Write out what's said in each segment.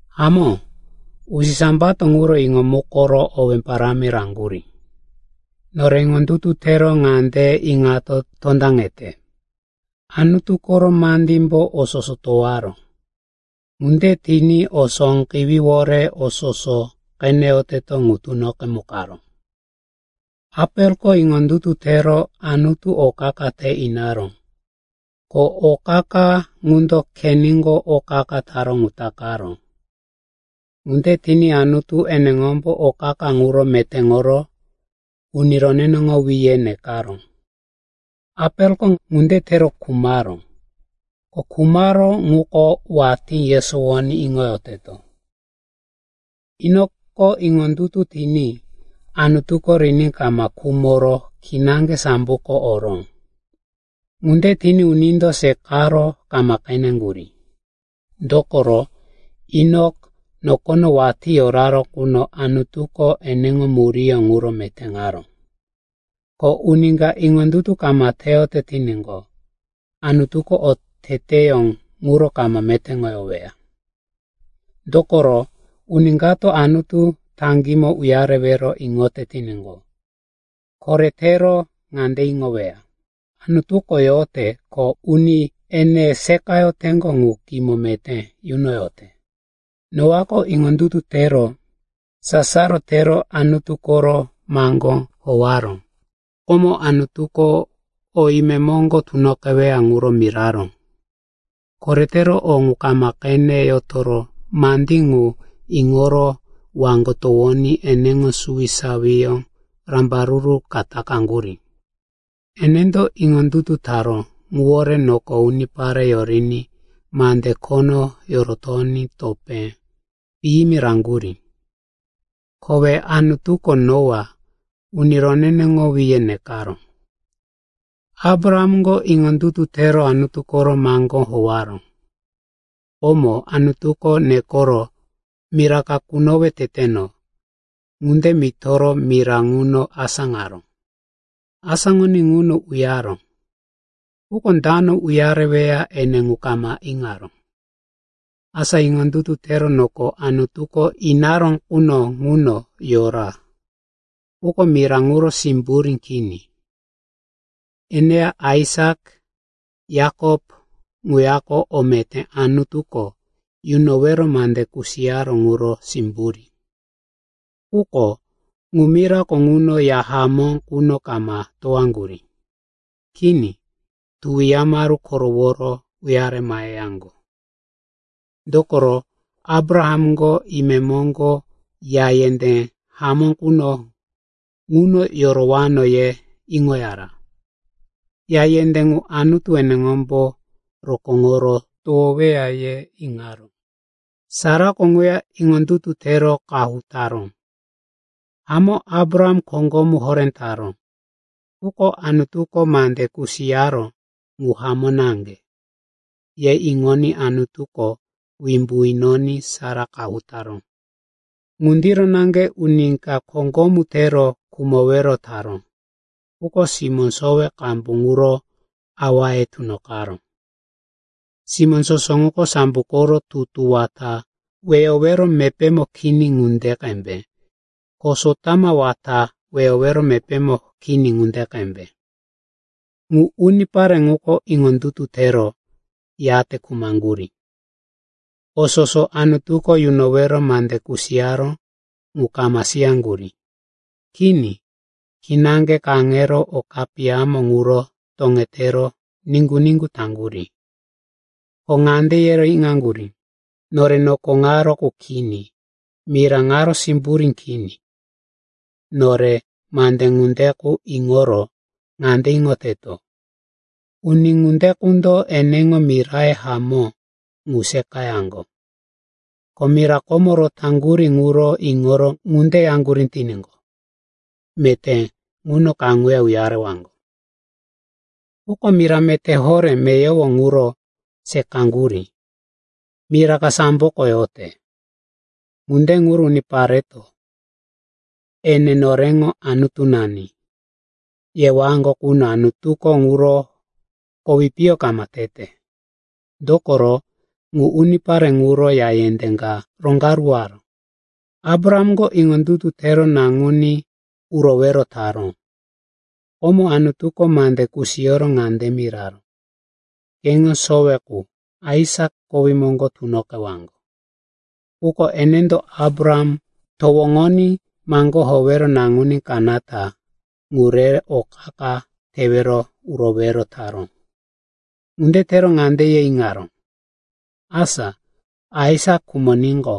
Hamó, usisambato ŋuro iŋomukoro owé parámi raŋgurí. Nore iŋondutu tero ŋande iŋato tondaŋete, Anutu koro mandímbo o soso towaró. Ŋunde tiní o sóqewíwore o soso qeneyoteto ŋu tunoqemukaró. Apeliko iŋondutu tero Anutu o qa-qa te inaró, ko o qa-qa ŋundo Keinko o qa-qa taró ŋu takaró. Ŋunde tiní Anutu eneŋombo o qa-qa ŋuro metéŋoro, uni roneneŋowí, ye nekaró. Apeliko ŋunde tero khumaró, ko khumaró ŋuko watí yesowoní iŋoyoteto. Enokiko iŋondutu tiní Anutuko riní kama khumoro kinaŋge samboko oró. Ŋunde tiní unindo seqaro kama qeneŋgurí. Dokoro, Enok nokono watí yora quno Anutuko eneŋo muríyó ŋuro metéŋaró. Ko uni ka iŋondutu kama teyote tiníqo, Anutuko oteteyó ŋuro kama metéŋoweya. Dokoro uni kato Anutu taŋgímo uyarewero iŋote tiníqo, koretero ŋande iŋoweya, Anutuko yote ko uni ene seqayoteŋgo ŋu kimo meté yunoyote. Noako iŋondutu tero sasaro tero Anutu koro maŋgó howaró. Komo Anutuko o imemoŋgo tunoqeweya ŋuro miraró. Koretero o ŋu kama qene yotoro mandí ŋu iŋoro waŋgo towoní eneŋo suwisawiyó rambaruru ka takaŋgurí. Enendo iŋondutu taró ŋuwore noko unipare yoriní mande khono yorotoní topé piyimi raŋgurí. Kowe Anutuko Noa, uni roneneŋowí, ye nekaró. Abrahamko iŋondutu tero Anutu koro maŋgó howaró. Komo Anutuko nekoro, mira ka kunowe teteno, ŋunde mitoro mira ŋuno asáŋaró. Asáŋoní ŋuno uyaró, quko dano uyareweya ene ŋu kama iŋaró. Asa iŋondutu tero noko Anutuko inaró quno ŋuno yora, quko mira ŋuro simburí kini. Eneya Aisak, Yakop ŋuyako o meté Anutuko yunowero mande kusiyaró ŋuro simburí. Quko ŋu mirako ŋuno ya hamó ŋuno kama towaŋgurí. Kini, tuwi yamaru koroworo uyare maheyaŋgo. Dokoro Abrahamko, imemoŋgo ya yendé hamó quno ŋuno yorowano, ye iŋoyara. Ya yendé ŋu Anutu eneŋombo rokóŋoro towoweya, ye iŋaró. Sarako ŋuya iŋondutu tero qahu taró. Hamó, Abraham koŋgomu horé taró, quko, Anutuko mande kusiyaró ŋu hamó naŋge, ye iŋoní Anutuko wimbu inoní Sara qahu taró. Ŋundiro naŋge uni ka koŋgomu tero khumowero taró, quko simó sowe qambu quro awaye tunoqaró. Simó soso ŋuko sambo koro tutu wata weyowero mepémo kini ŋunde qembe, ko sotama wata weyowero mepémo kini ŋunde qembe. Ŋu unipare ŋuko iŋondutu tero, yate khumaŋgurí. O soso Anutuko yunowero mande kusiyaró ŋu kama siyaŋgurí. Kini, kinaŋge kaŋero o kapiyamo ŋuro toŋetero niŋgu-niŋgu taŋgurí. Ko ŋande yero iŋaŋgurí, “Nore noko ŋaro qu kini, mira ŋaro simburí kini.” Nore mande ŋunde qu iŋoro ŋande iŋoteto, uni ŋunde qundo eneŋo miraye hamó ŋu seqayaŋgo. Ko mira komo rotaŋgurí ŋuro iŋoro ŋunde yaŋgurí tiníqo, meté ŋuno kaŋuya uyarewaŋgo. Quko mira meté horé meyowo ŋuro seqaŋgurí, mira ka samboko yote. Ŋunde ŋuro unipareto, “Ene noreŋo Anutunani,” yewaŋgo quno Anutuko ŋuro kowi piyo kama tete. Dokoro, ŋu unipare ŋuro ya yendé ka roŋgaruwaró. Abrahamko iŋondutu tero naŋuní urowero taró. Komo Anutuko mande kusiyoro ŋande miraró, “Keŋo sowe qu Aisak kowí moŋgo tunoqewaŋgo.” Quko enendo Abraham towoŋoní maŋgó howero naŋuní kanata ŋu rero o qa-qa tewero urowero taró. Ŋunde tero ŋande ye iŋaró, “Asa Aisak khumoníqo,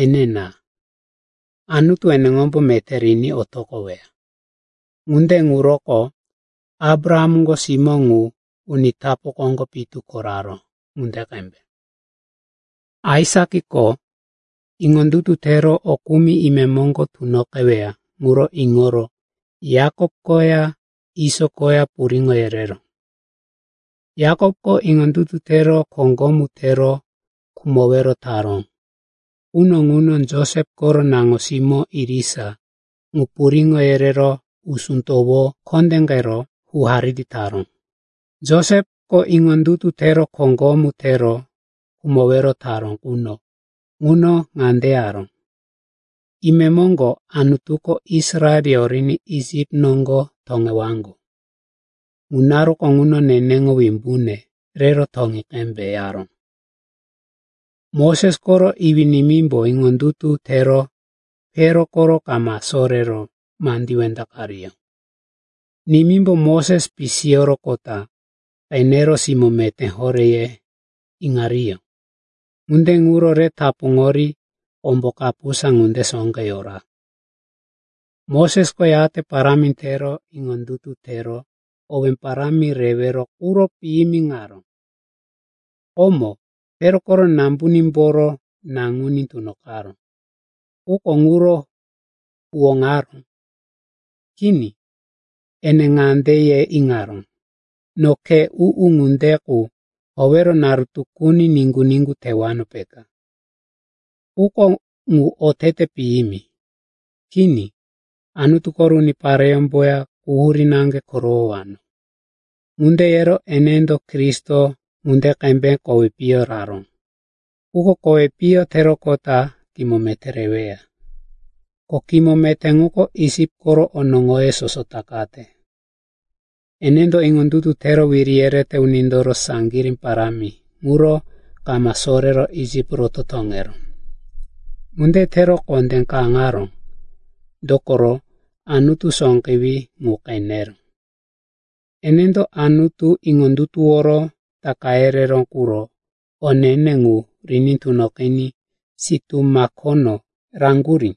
enina, Anutu eneŋombo meté riní otoqoweya.” Ŋunde ŋuroko Abrahamko simó ŋu uni tapu koŋgo pitu ko raró ŋunde qembe. Aisakiko iŋondutu tero o kumi imemoŋgo tunoqeweya ŋuro iŋoro Yakop koya Iso koya puriŋo yereró. Yakopko iŋondutu tero koŋgomu tero khumowero taró quno ŋuno Josep koro naŋo-simó irisa ŋu puriŋo yerero usú towo kondéqero hu-hariri taró. Josepko iŋondutu tero koŋgomu tero khumowero taró quno ŋuno ŋande yaró, “Imemoŋgo Anutuko Israel yoriní Isip noŋgo toŋewaŋgo. Ŋu naruko ŋuno neneŋo wimbune rero toŋi qembe,” yaró. Moses koro iwí-nimímbo iŋondutu tero Pero koro kama sorero mandí wendaqariyó. Nimímbo Moses pisiyoroqota qenero, simó meté horé, ye iŋariyó. Ŋunde ŋuro re tapuŋori kombo kapusa ŋunde sóqe yora. Mosesko yate parámi tero iŋondutu tero owé parámi rewero quro piyimiŋaró. Komo Pero koro nambunímboro naŋuní tunoqaró, quko ŋuro huwóŋaró. Kini, ene ŋande ye iŋaró, “No khe u-u ŋunde qu howero naru tukuni niŋgu-niŋgu tewano, peka. Quko ŋu otete piyimi. Kini, Anutu koro unipareyómboya quhurí naŋge korowowano.” Ŋunde yero enendo Kristo ŋunde qembe kowi piyo raró, quko kowi piyo teroqota kimo meté reweya. Ko kimo meté ŋuko Isip koro onoŋoye soso takate. Enendo iŋondutu tero wiri yerete unindoro saŋgirí parámi ŋuro kama sorero Isip roto toŋeró. Ŋunde tero kondé kaŋaró, dokoro Anutu sóqewí ŋu qeneró. Enendo Anutu iŋondutuworo Taka yereró quro o ne-ne ŋu riní tunoqiní sitú makono raŋgurí.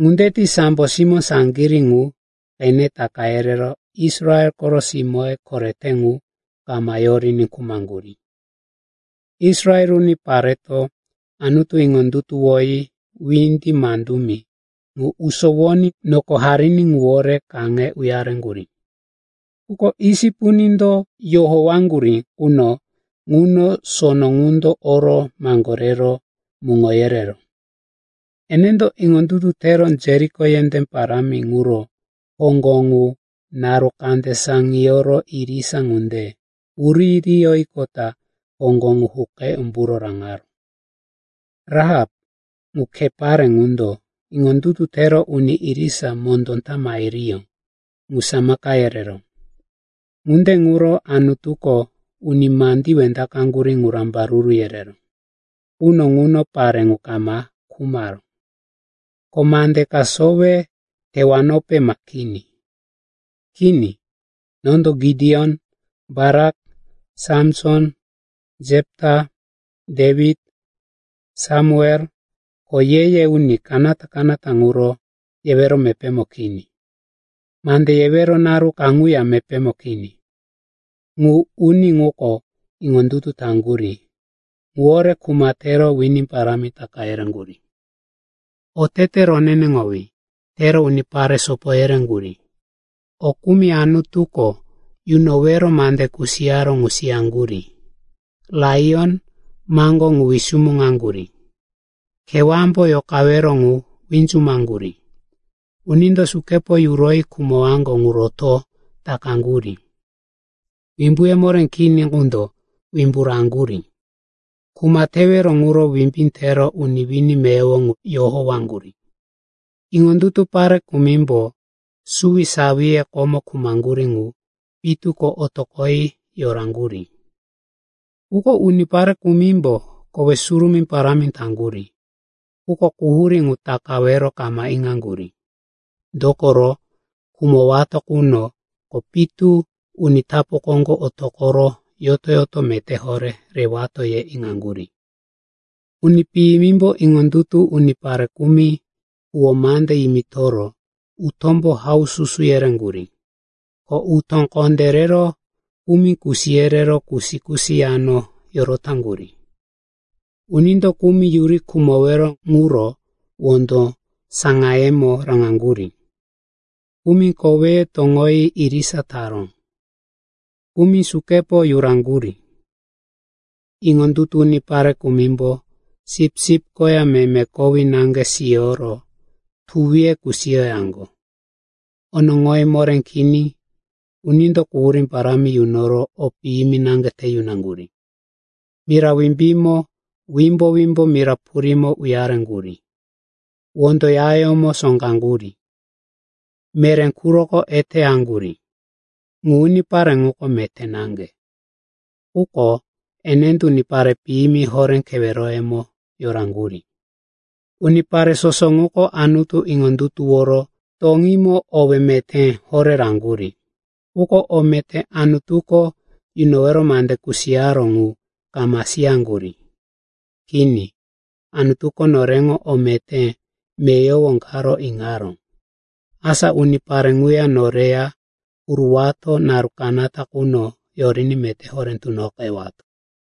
Ŋunde ti sambo simó saŋgirí ŋu qene taka yerero Israel koro simóye korete ŋu kama yoriní khumaŋgurí. Israel unipareto Anutu iŋondutuwoyi Windi Mandumi ŋu usowoní noko hariní ŋuwore kaŋero uyareŋgurí. Quko Isip unindo yohowaŋgurí quno ŋuno sono ŋundo oro maŋgorero muŋo yereró. Enendo iŋondutu tero Jeriko yendé parámi ŋuro hoŋgo ŋu naru kande saŋiyoro irisa ŋunde wuririyoyiqota hoŋgo ŋu huqe umbu raŋaró. Rahap, ŋu khe pare ŋundo iŋondutu tero uni irisa mondó ta mahiriyó ŋu samaka yereró. Ŋunde ŋuro Anutuko uni mandí wendaqaŋgurí ŋu rambaruru yereró quno ŋuno pare ŋu kama khumaró. Ko mande ka sowe tewanope ma kini? Kini, nondo Gideon, Barak, Samson, Jepita, Dewit, Samuel ko ye-ye uni kanata-kanata ŋuro yewero mepémo kini. Mande yewero naru kaŋuya mepémo kini. Ŋu uni ŋuko iŋondutu taŋgurí ŋuwore kuma tero wini parámi taka yereŋgurí, otete roneneŋowí tero unipare sopo yereŋgurí, o kumi Anutuko yunowero mande kusiyaró ŋu siyaŋgurí, laiyon maŋgó ŋu wisumuŋaŋgurí. Kewámbo yoqawero ŋu winzumaŋgurí, unindo sukepo yuroyi khumowaŋgo ŋu roto takaŋgurí, wimbuye moré kini qundo wimbu raŋgurí, kuma tewero quro wimbí tero uni wini meyowo ŋu yohowaŋgurí. Iŋondutu pare kumimbo suwisawiye komo khumaŋgurí qu pitu ko otoqoyi yoraŋgurí. Quko unipare kumimbo kowe surumí parámi taŋgurí, quko quhurí ŋu takawero kama iŋaŋgurí, dokoro, khumowato qunoko pitu uni tapu koŋgo otoqoro yoto-yoto meté horé rewato, ye iŋaŋgurí. Uni piyimimbo iŋondutu unipare kumi huwó mande yimitoro utómbo haususu yereŋgurí. Ko utó kondé rero kumi kusi yerero kusi-kusi yano yorotaŋgurí. Unindo kumi yuri khumowero ŋuro wondo saŋayemo raŋaŋgurí, kumi koweye toŋoyi irisa taró, kumi sukepo yuraŋgurí. Iŋondutu unipare kumimbo sipsip koya meme kowí naŋge siyoro tuwiye kusiyoyaŋgo, onoŋoye moré kini, unindo quhurí parámi yunoro o piyimi naŋge te yunaŋgurí. Mira wimbímo, wimbo-wimbo mira purímo uyareŋgurí; wondo yayómo sóqaŋgurí, meré quroko eteyaŋgurí. Ŋu unipare ŋuko meté naŋge, quko enendo unipare piyimi horé keweroyemo yoraŋgurí. Unipare soso ŋuko Anutu iŋondutuworo toŋímo owé meté horé raŋgurí. Quko o meté Anutuko yunowero mande kusiyaró ŋu kama siyaŋgurí. Kini, Anutuko noreŋo o meté meyowo karo iŋaró, asa unipare ŋuya noreya huruwato naru kanata quno yoriní meté horé tunoqewato.